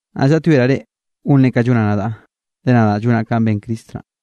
Naꞌ llaꞌtyoeraꞌ reꞌ gonre kanꞌ llonaꞌ nadaꞌ, le nadaꞌ llonaꞌ kanꞌ ben Cristo naꞌ.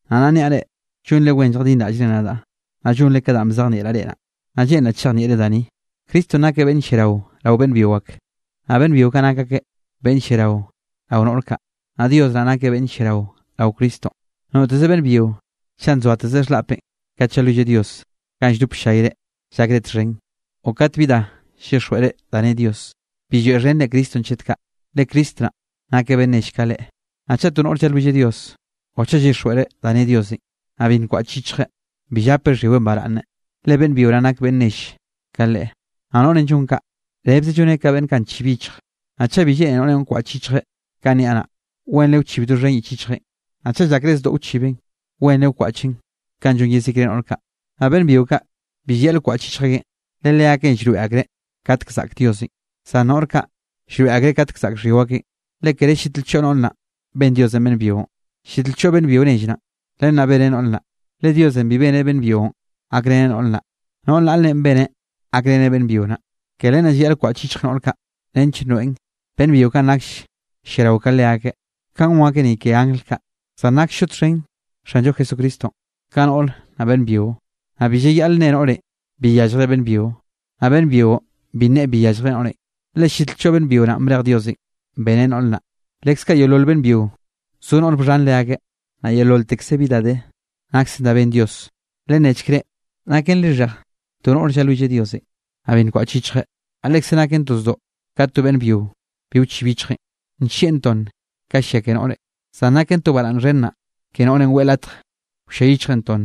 Naꞌ nnaꞌ niaꞌ reꞌ, llonre wen lljadinraꞌllre nadaꞌ, naꞌ llonre ka danꞌ bzejnieꞌraꞌ reꞌ naꞌ. Naꞌ lleꞌnraꞌ chejnieꞌre da ni, Cristonꞌ nakeꞌ beꞌnn lliarao rao beꞌnn byio ak. Naꞌ beꞌnn byio kaꞌ nak akeꞌ beꞌnn lliarao rao noꞌr kaꞌ. Naꞌ Dios naꞌ nakeꞌ beꞌnn lliarao rao Cristonꞌ. Noteze beꞌnn byio, chaꞌ nzoateze xhlaꞌpeꞌ kat llalwilleꞌ Dios ganꞌ lldop ll-llayre llakre txhen, o kat bi da llyixjweꞌreꞌ da ne Dios, bi lloeꞌxheneꞌ Cristonꞌ chet kaꞌ, le Cristo naꞌ nakeꞌ beꞌnn nell ka leꞌe. Naꞌ chaꞌ to noꞌre llalwilleꞌ Dios o chaꞌ llyixjweꞌreꞌ da ne Diosenꞌ, naꞌ bi nkwaꞌch yichjeꞌ, bi llapeꞌ xhyiweꞌn baraꞌnne, le beꞌnn byio naꞌn nak beꞌnn nell ka leꞌe. Naꞌ noꞌrenꞌ llon kaꞌ, rebze lloneꞌ ka beꞌnn kaꞌ nchib yichj. Naꞌ chaꞌ bi lleꞌne noꞌrenꞌ wkwaꞌch yichjeꞌn kanꞌ niaꞌ naꞌ, wenre wchibeꞌ doxhen yich yichjeꞌn. Naꞌ chaꞌ llakreꞌ zdoꞌ wchibeꞌn, wenre wkwaꞌcheꞌn kanꞌ llon yezikre noꞌr kaꞌ. Naꞌ beꞌnn byio kaꞌ, bi llayaꞌl wkwaꞌch yichj akeꞌn, le leakeꞌn llroeꞌ akreꞌ katek zaꞌk Diosenꞌ. Zan noꞌr kaꞌ, llroeꞌ akreꞌ katk zaꞌk xhyio akeꞌn. Le kere llit lchoꞌ noꞌr naꞌn ben Diosenꞌ beꞌnn byionꞌ, llit lchoꞌ beꞌnn byio nell naꞌ, len naꞌ beneꞌ noꞌr naꞌ. Le Diosenꞌ bi beneꞌ beꞌnn byionꞌ gakreneꞌ noꞌr naꞌ, noꞌr naꞌlenꞌ beneꞌ gakreneꞌ beꞌnn byio naꞌ. Ke len naꞌ llayaꞌl wkwaꞌch yichj noꞌr kaꞌ nench nroeꞌn, beꞌnn byio kaꞌn nakll lliarao ka leakeꞌ, kaꞌn gon akeꞌ ni ke angl kaꞌ. Zan naksllo txhen Xanllo Jesucristonꞌ, ka noꞌre, naꞌ beꞌnn byio; naꞌ bi llayaꞌl nne noꞌrenꞌ bi yalljreꞌ beꞌnn byio, naꞌ beꞌnn byionꞌ bi nneꞌe bi yalljreꞌ noꞌrenꞌ. Le llit lchoꞌ beꞌnn byio naꞌn brej Diosenꞌ beneꞌ noꞌr naꞌ, leskaꞌ yeololte beꞌnn byio zo noꞌre bxhan leakeꞌ, naꞌ yeololtekze bi da de naksen da ben Dios. Lennechk reꞌ, ¿naken lixhej to noꞌre llalwilleꞌ Diosenꞌ, naꞌ bi nkwaꞌch yichjeꞌ? Naꞌ lekze naken to zdoꞌ kat to beꞌnn byio bi wchib yichjeꞌn, nllieꞌn tonn ka llia ke noꞌre. Zan naken to baraꞌnn xhen naꞌ ke noꞌrenꞌ weꞌe latj wllia yichjeꞌn tonn,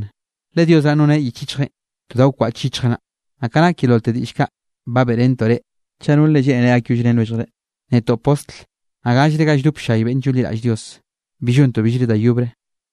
le Dios naꞌn noneꞌ yich yichjeꞌn to da wkwaꞌch yichjeꞌ naꞌ. Naꞌ ka nak yeololte diꞌll kaꞌ ba beꞌrentoꞌ reꞌ, chaꞌ nolre lleꞌnere gakyollrén lwelljre, netoꞌ postl, naꞌ gallre ga lldop ll-llay beꞌnn llonliraꞌll Dios, bi llontoꞌ billre da yobre.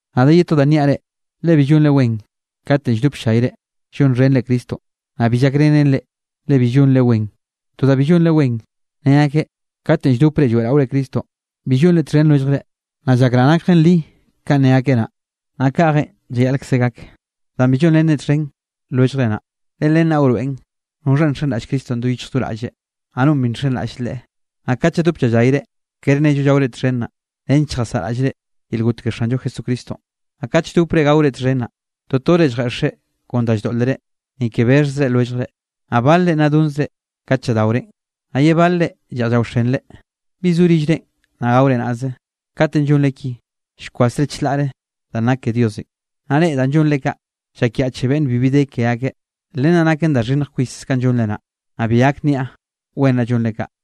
Naꞌ de ye to da nniaꞌ reꞌ, le bi llonre wen katenꞌ lldop ll-llayre llonxhenre Cristonꞌ, naꞌ bi llakrenen reꞌ, le bi llonre wen. To da bi llonre wen, ne akeꞌ katenꞌ lldopre lloeꞌraore Cristonꞌ, bi llonre txhen lwelljre, naꞌ llakraꞌ nakjen li kanꞌ ne akeꞌ naꞌ. Naꞌ kaꞌjenꞌ llayaꞌlkze gak danꞌ bi llonrenre txhen lwelljre naꞌ, le len naꞌ wroeꞌn noxhanꞌ nxenraꞌll Cristonꞌ do yichj do raꞌlleꞌ, naꞌ nonꞌ bi nxenraꞌll Leꞌe. Naꞌ kat lladop llallayre, kere nnello llaore txhen naꞌ, nench lljasaꞌraꞌllre yel got ke Xanllo Jesucristonꞌ. Naꞌ kat lldopre gaore txhen naꞌ, totore lljeꞌxre kon da lldoꞌlere, ni ke bexhze lwelljre, naꞌ balre nna donzre kat lladaorenꞌ, naꞌ ye balre lleꞌj llaoxenre. ¿Bi zo rillre naꞌ gaore naꞌzenꞌ? Katenꞌ llonre ki, llkwasre chlaꞌre danꞌ nak ke Diosenꞌ, naꞌ reꞌ danꞌ llonre kaꞌ, llakyaꞌche beꞌnn bibi de ke akeꞌ. Len naꞌ naken da xhinnj kwis kanꞌ llonre naꞌ, naꞌ bi gak nniaꞌ wen naꞌ llonre kaꞌ.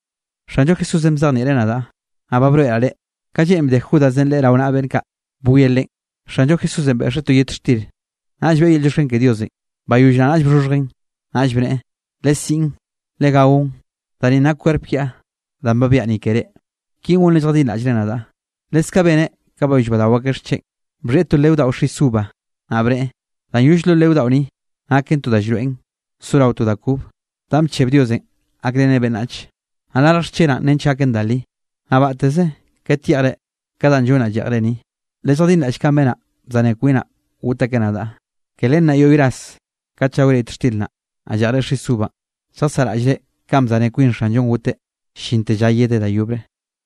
Xanllo Jesúsenꞌ bzejnieꞌreꞌ nadaꞌ, naꞌ ba broeꞌraꞌ reꞌ. Ka lleꞌn bde Judasenꞌ Leꞌe rao naꞌa beꞌnn kaꞌ bwie Leꞌen, Xanllo Jesúsenꞌ beꞌxeꞌ to yet xtir. Naꞌll beꞌe yel llioxken ke Diosenꞌ, bayoll naꞌ naꞌll bxhoxhjeꞌn, naꞌll bneꞌe: “Lesiꞌn, Legaon. Da ninꞌ nak kwerp kiaꞌ danꞌ ba biaꞌa ni keré. Kinꞌ gonre lljadinraꞌllre nadaꞌ.” Leskaꞌ beneꞌ ka bayoll badao akeꞌ xcheꞌn, bxhieꞌ to leo daꞌo xis uva, naꞌ bneꞌe: “Danꞌ yoll lo leo daꞌo ni, naken to da llroeꞌn sorao to da kob danꞌ bcheb Diosenꞌ gakreneꞌ beꞌnnach. Naꞌ larj xchenaꞌn nench gaken da li. Naꞌ batteze kat yeꞌjre ka danꞌ llonnaꞌ lleꞌjre ni, lelljadinraꞌll kanꞌ benaꞌ bzane kwinaꞌ got akeꞌ nadaꞌ.” Ke len naꞌ yoꞌy ras kat llaore yet xtir naꞌ, naꞌ lleꞌjre xis uvanꞌ, lljasaraꞌllre kanꞌ bzane kwin Xanllonꞌ goteꞌ, llinte lla yedeꞌ da yobre.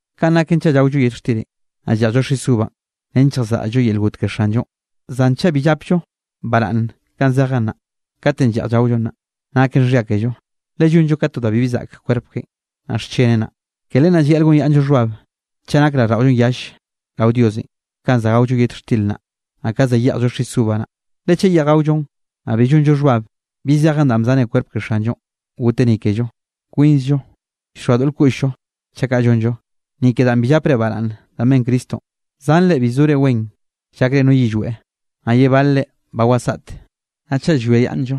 Kanꞌ naken chaꞌ llaollo yet xtirenꞌ, naꞌ lleꞌjllo nis uvanꞌ nench lljasaꞌraꞌll-llo yel got ke Xanllonꞌ. Zan chaꞌ bi llapllo baraꞌnn kanꞌ zejen naꞌ, katenꞌ lleꞌj llaollon naꞌ, naken xhia kello, le llonllo ka to da bibi zaꞌk kwerp keꞌen, naꞌ xcheneꞌ naꞌ. Ke len naꞌ llayaꞌl gonyaꞌnnllo xhbab chaꞌ nak raꞌlldaꞌollonꞌ yall rao Diosenꞌ ka za gaollo yet xtir naꞌ, naꞌ ka za yeꞌjllo xis uva naꞌ. Le chaꞌ yeꞌj gaollo, naꞌ bi llonllo xhbab bi zejen danꞌ bzane kwerp ke Xanllo goteꞌ ni kello, kwinzllo llxoa doꞌl koꞌll-llo, chaꞌ kaꞌ llonllo. Ni ke danꞌ bi llapre baraꞌnn danꞌ ben Cristonꞌ, zanre bi zore wen llakre no yillweꞌ, naꞌ ye balre ba wasaꞌte. Naꞌ chaꞌ llwiayaꞌnnllo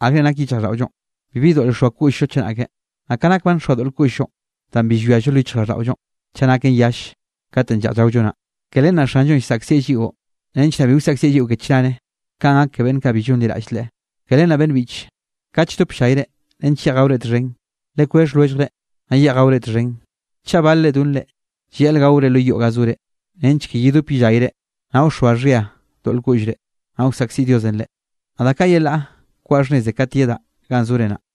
akre nak yichjraꞌlldaꞌollo, bibi doꞌl llxoa koꞌll-llo chenake. Naꞌ ka nak ba nxoa doꞌl koꞌll-llo danꞌ bi llwiallo lo yichjraꞌlldaꞌollonꞌ chaꞌ naken yall katenꞌ lleꞌj llaollo naꞌ, ke len naꞌ Xanllonꞌ llsaꞌkzieꞌ lliꞌo nench naꞌ bi wsaꞌkzieꞌ lliꞌo ke chnare kanꞌ gak ke beꞌnn kaꞌ bi llonliraꞌll Leꞌe. Ke len naꞌ beꞌnn biꞌche, kat lldop ll-llayre nench yeꞌj gaore txhen, lekwexh lwelljre, naꞌ yeꞌj gaore txhen. Chaꞌ balre donre, llayaꞌl gaore lo yoꞌ ga zore nench ke yedop yellayre, naꞌ wxoa xhia doꞌl koꞌllre, naꞌ wsaꞌkziꞌ Diosenꞌ reꞌ. Naꞌ da kaꞌ yelaꞌ koaꞌ xhnneze kat yedaꞌ ganꞌ zore naꞌ.